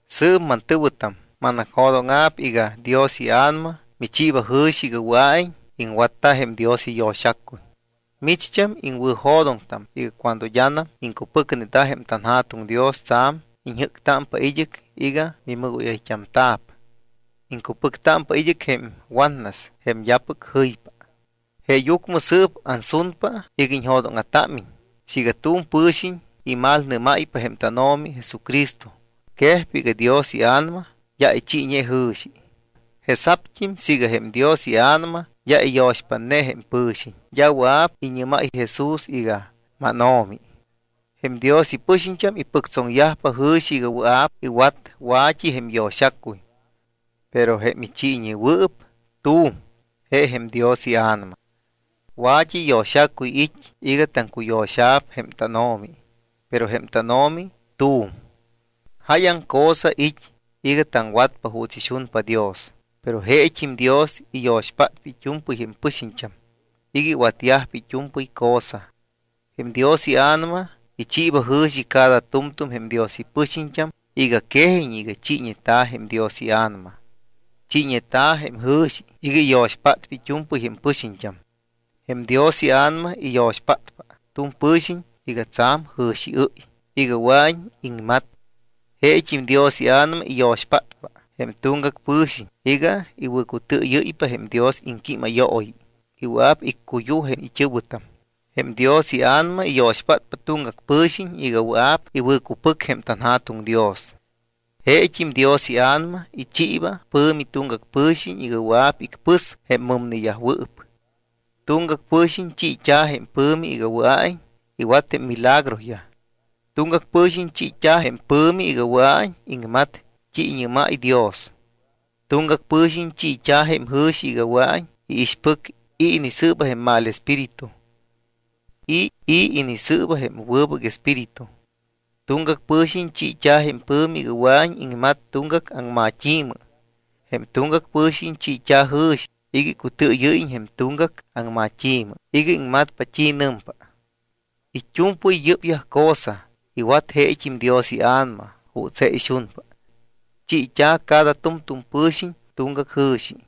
Sɨɨp, mantɨ̱wɨtam, manacjo̱dóŋa̱p iga Dios iA̱nama michiiba jɨ̱xi iga wɨa̱iñ iŋwatta jém Dios iyo̱xacuy. Micht́am iŋwɨ̱jo̱doŋtam iga cuando d́anam iŋcupɨcneta jém tanJa̱tuŋ Dios, tsa̱m iñjɨ́ctámpa id́ɨc iga mimɨgóyayt́amta̱p. Iŋcupɨctámpa id́ɨc jém watnas jém d́apɨc jɨypa. Jeeyucmɨ sɨɨp ansunpa iga iñjo̱dóŋa̱támiñ siiga tu̱m pɨ̱xiñ imalnɨ́máypa jém tánO̱mi Jesucristo, quejpa iga Dios iA̱nama d́a ichiiñe jɨ̱xi. Jesa̱pt́im siiga jém Dios iA̱nama d́a iyo̱xpátñe jém pɨ̱xiñ, d́a wɨa̱p iñɨ́máy Jesús iga: “MánO̱mi.” Jém Dios ipɨxiñt́am ipɨctsoŋyajpa jɨ̱xi iga wɨa̱p iwat wa̱t́i jém yo̱xacuy, pero jém ichiiñewɨɨp tu̱m, je jém Dios iA̱nama. Wa̱t́i yo̱xacuy it́ iga taŋcuyo̱xa̱p jém tánO̱mi, pero jém tánO̱mi tu̱m. Jáyaŋ cosa it́ iga taŋwatpa juuts ixunpa Dios, pero jeet́im Dios iyo̱xpátpa it́u̱mpɨy jém pɨxiñt́am iga iwatyajpa it́u̱mpɨy cosa. Jém Dios iA̱nama ichiiba jɨ̱xi cada tu̱mtu̱m jém Dios ipɨxiñt́am iga quejiñ iga chiiñeta̱ jém Dios iA̱nama. Chiiñeta̱ jém jɨ̱xi iga iyo̱xpátpa it́u̱mpɨy jém ipɨxiñt́am. Jém Dios iA̱nama iyo̱xpátpa tu̱m pɨ̱xiñ iga tsa̱m jɨ̱xiɨ́y iga wɨa̱iñ iŋmat. Jeet́im Dios iA̱nama iyo̱xpátpa jém tuŋgac pɨ̱xiñ iga iwɨ̱cutɨɨyɨ́ypa jém Dios iŋquímayooyi y wɨa̱p iccuyuj jém it́ɨ̱wɨtam. Jém Dios iA̱nama iyo̱xpátpa tuŋgac pɨ̱xiñ iga wɨa̱p iwɨ̱cupɨc jém tanJa̱tuŋ Dios. Jeet́im Dios iA̱nama ichiiba pɨ̱mi tuŋgac pɨ̱xiñ iga wɨa̱p icpɨs jém mɨmneyajwɨɨp. Tuŋgac pɨ̱xiñ chiit́a̱ jém pɨ̱mi iga wɨa̱iñ iwat jém milagroyaj. Tuŋgac pɨ̱xiñ chiit́a̱ jém pɨ̱mi iga wɨa̱iñ iŋmat t́i iñɨ́máy Dios. Tuŋgac pɨ̱xiñ chiit́a̱ jém jɨ̱xi iga wɨa̱iñ iixpɨc i̱ inisɨɨba jém mal espíritu y i̱ inisɨɨba jém wɨbɨc espíritu. Tuŋgac pɨ̱xiñ chiit́a̱ jém pɨ̱mi iga wɨa̱iñ iŋmat tuŋgac aŋmat́i̱mɨ. Jém tuŋgac pɨ̱xiñ chiit́a̱ jɨ̱xi iga icutɨɨyɨ́yiñ jém tuŋgac aŋma̱t́i iga iŋmatpa t́i nɨmpa. It́u̱mpɨy yɨ́pyaj cosa iwat jeet́im Dios iA̱nama juuts je ixunpa. Chiit́a̱ cada tu̱mtu̱m pɨ̱xiñ tuŋgac jɨ̱xi.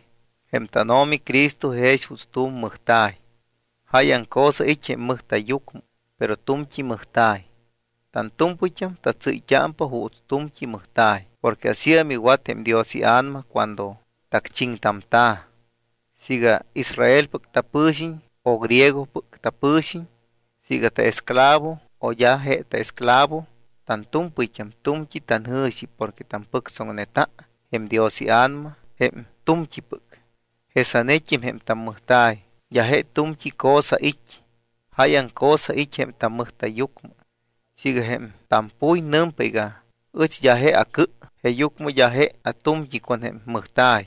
Jém tánO̱mi Cristo jex juuts tu̱m mɨjta̱y. Jáyaŋ cosa it́ jém mɨjta̱yyucmɨ, pero tu̱mt́i mɨjta̱y. Tantu̱mpɨyt́am tatsɨ́yt́ámpa juuts tu̱mt́i mɨjta̱y porque asíam iwat jém Dios iA̱nama cuando tacchiŋtamta̱. Siiga Israelpɨc tapɨ̱xiñ o griegopɨc tapɨ̱xiñ, siiga taesclavo o d́a je taesclavo tantu̱mpɨyt́am tu̱mt́i tanjɨ̱xi porque tampɨctsoŋneta jém Dios iA̱nama jém tu̱mt́ipɨc. Jesanet́im jém tammɨjta̱y d́a je tu̱mt́i cosa it́, jáyaŋ cosa it́ jém tammɨjta̱yyucmɨ. Siiga jém tampuy nɨmpa iga: “Ɨch d́a je acɨ, jeeyucmɨ d́a je atu̱mt́i con jém mɨjta̱y”,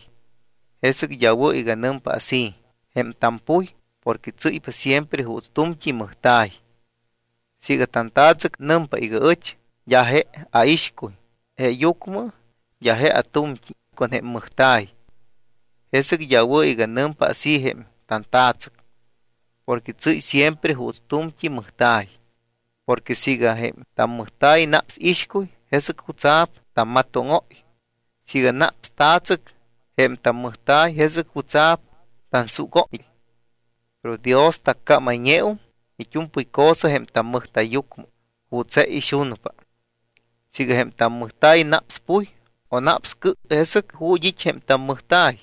jesɨc d́a wɨ̱ iga nɨmpa así jém tampuy porque tsɨ́ypa siempre juuts tu̱mt́i mɨjta̱y. Siiga tanta̱tsɨc nɨmpa iga: “Ɨch d́a je aixcuy, jeeyucmɨ d́a je atu̱mt́i con jém mɨjta̱y”, jesɨc d́a wɨ̱ iga nɨmpa así jém tanta̱tsɨc porque tsɨ́ypa siempre juuts tu̱mt́i mɨjta̱y. Porque siiga jém tammɨjta̱y naps ixcuy, ¿jesɨc jutsa̱p tammatóŋóy? Siiga naps ta̱tsɨc jém tammɨjta̱y, ¿jesɨc jutsa̱p tansugóy? Pero Dios taccámayñeum it́u̱mpɨy cosa jém tammɨjta̱yyucmɨ juuts je ixunpa. Siiga jém tammɨjta̱y naps puy o naps cɨ, ¿jesɨc ju̱t́ it́ jém tammɨjta̱y?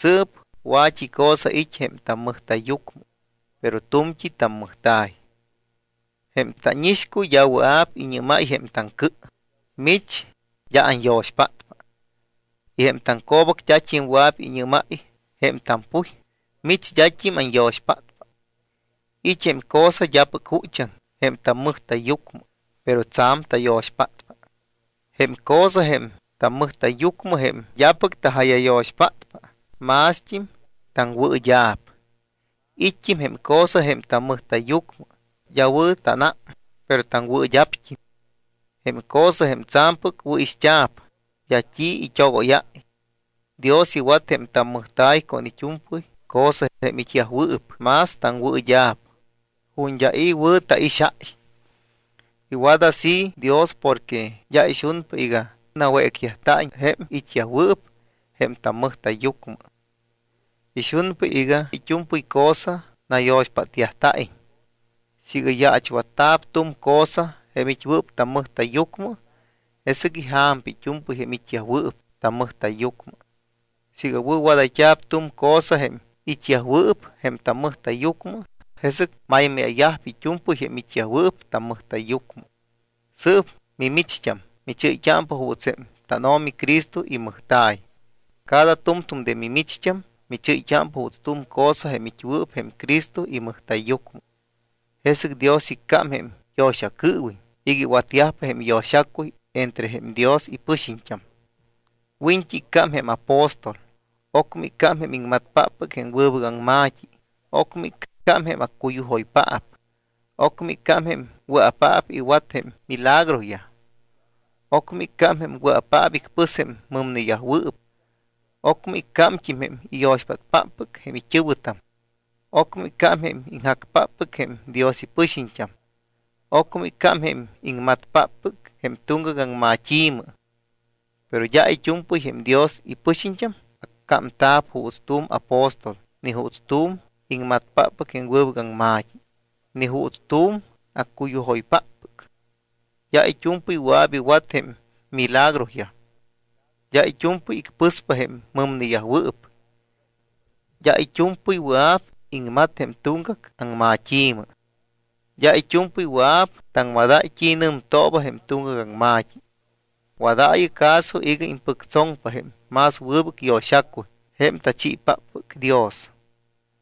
Sɨɨp wa̱t́i cosa it́ jém tammɨjta̱yyucmɨ, pero tu̱mt́i tammɨjta̱y. Jém tánixcuy d́a wɨa̱p iñɨ́máy jém taŋcɨ: “Mich d́a anyo̱xpátpa.” Y jém taŋco̱bac d́at́im wɨa̱p iñɨ́máy jém tampuy: “Mich d́at́im anyo̱xpátpa.” It́ jém cosa d́apɨc juchaŋ jém tammɨjta̱yyucmɨ, pero tsa̱m tayo̱xpátpa. Jém cosa jém tammɨjta̱yyucmɨ, jém d́apɨc taja̱yayo̱xpátpa, mást́im taŋwɨɨd́a̱p. It́t́im jém cosa jém tammɨjta̱yyucmɨ d́a wɨ̱ tánám, pero taŋwɨɨd́a̱pt́im. Jém cosa jém tsa̱mpɨc wɨ̱ixt́a̱p, d́a t́i it́ogóyáy. Dios iwat jém tammɨjta̱y con it́u̱mpɨy cosa, jém it́yajwɨɨp más taŋwɨɨd́a̱p, ju̱t́ d́a i̱ wɨ̱ taixáy. Iwat así Dios porque d́a ixunpa iga nawécyajta̱iñ jém it́yajwɨɨp jém tammɨjta̱yyucmɨ. Ixunpa iga it́u̱mpɨy cosa nayo̱xpátyajta̱iñ. Siiga yaachwatta̱p tu̱m cosa, jém it́wɨɨp tammɨjta̱yyucmɨ, jesɨc ija̱mpa it́u̱mpɨy jém it́yajwɨɨp tammɨjta̱yyucmɨ. Siiga wɨ̱wadayt́a̱p tu̱m cosa, jém it́yajwɨɨp jém tammɨjta̱yyucmɨ, jesɨc maymáya̱yajpa it́u̱mpɨy jém it́yajwɨɨp tammɨjta̱yyucmɨ. Sɨɨp mimicht́am michɨ́yt́ámpa juuts jém tánO̱mi Cristo imɨjta̱y. Cada tu̱mtu̱m de mimicht́am michɨ́yt́ámpa juuts tu̱m cosa jém it́wɨɨp jém Cristo imɨjta̱yyucmɨ. Jesɨc Dios iccám jém yo̱xacɨɨwiñ iga iwatyajpa jém yo̱xacuy entre jém Dios ipɨxiñt́am. Wiñt́i iccám jém apóstol, ocmɨ iccám jém iŋmatpáppɨc jém wɨbɨc aŋma̱t́i, ocmɨ iccám jém accuyujoypaap, ocmɨ iccám jém wɨa̱paap iwat jém milagroyaj, ocmɨ iccám jém wɨa̱paap icpɨs jém mɨmneyajwɨɨp, ocmɨ iccámt́im jém iyo̱xpátpáppɨc jém it́ɨ̱wɨtam, ocmɨ iccám jém iŋjacpáppɨc jém Dios ipɨxiñt́am, ocmɨ iccám jém iŋmatpáppɨc jém tuŋgac aŋmat́i̱mɨ. Pero d́a it́u̱mpɨy jém Dios ipɨxiñt́am accámta̱p juuts tu̱m apóstol ni juuts tu̱m iŋmatpáppɨc jém wɨbɨc aŋma̱t́i, ni juuts tu̱m accuyujoypáppɨc. D́a it́u̱mpɨy wɨa̱p iwat jém milagroyaj. D́a it́u̱mpɨy icpɨspa jém mɨmneyajwɨɨp, d́a it́u̱mpɨy wɨa̱p iŋmat jém tuŋgac aŋmat́i̱mɨ. D́a it́u̱mpɨy wɨa̱p taŋmadáy t́i nɨmtooba jém tuŋgac aŋma̱t́i. Wadaayɨ caso iga impɨctsoŋpa jém más wɨbɨc yo̱xacuy jém tachiipáppɨc Dios.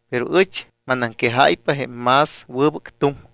Pero ɨch manaŋquejáypa jém más wɨbɨc tuŋ.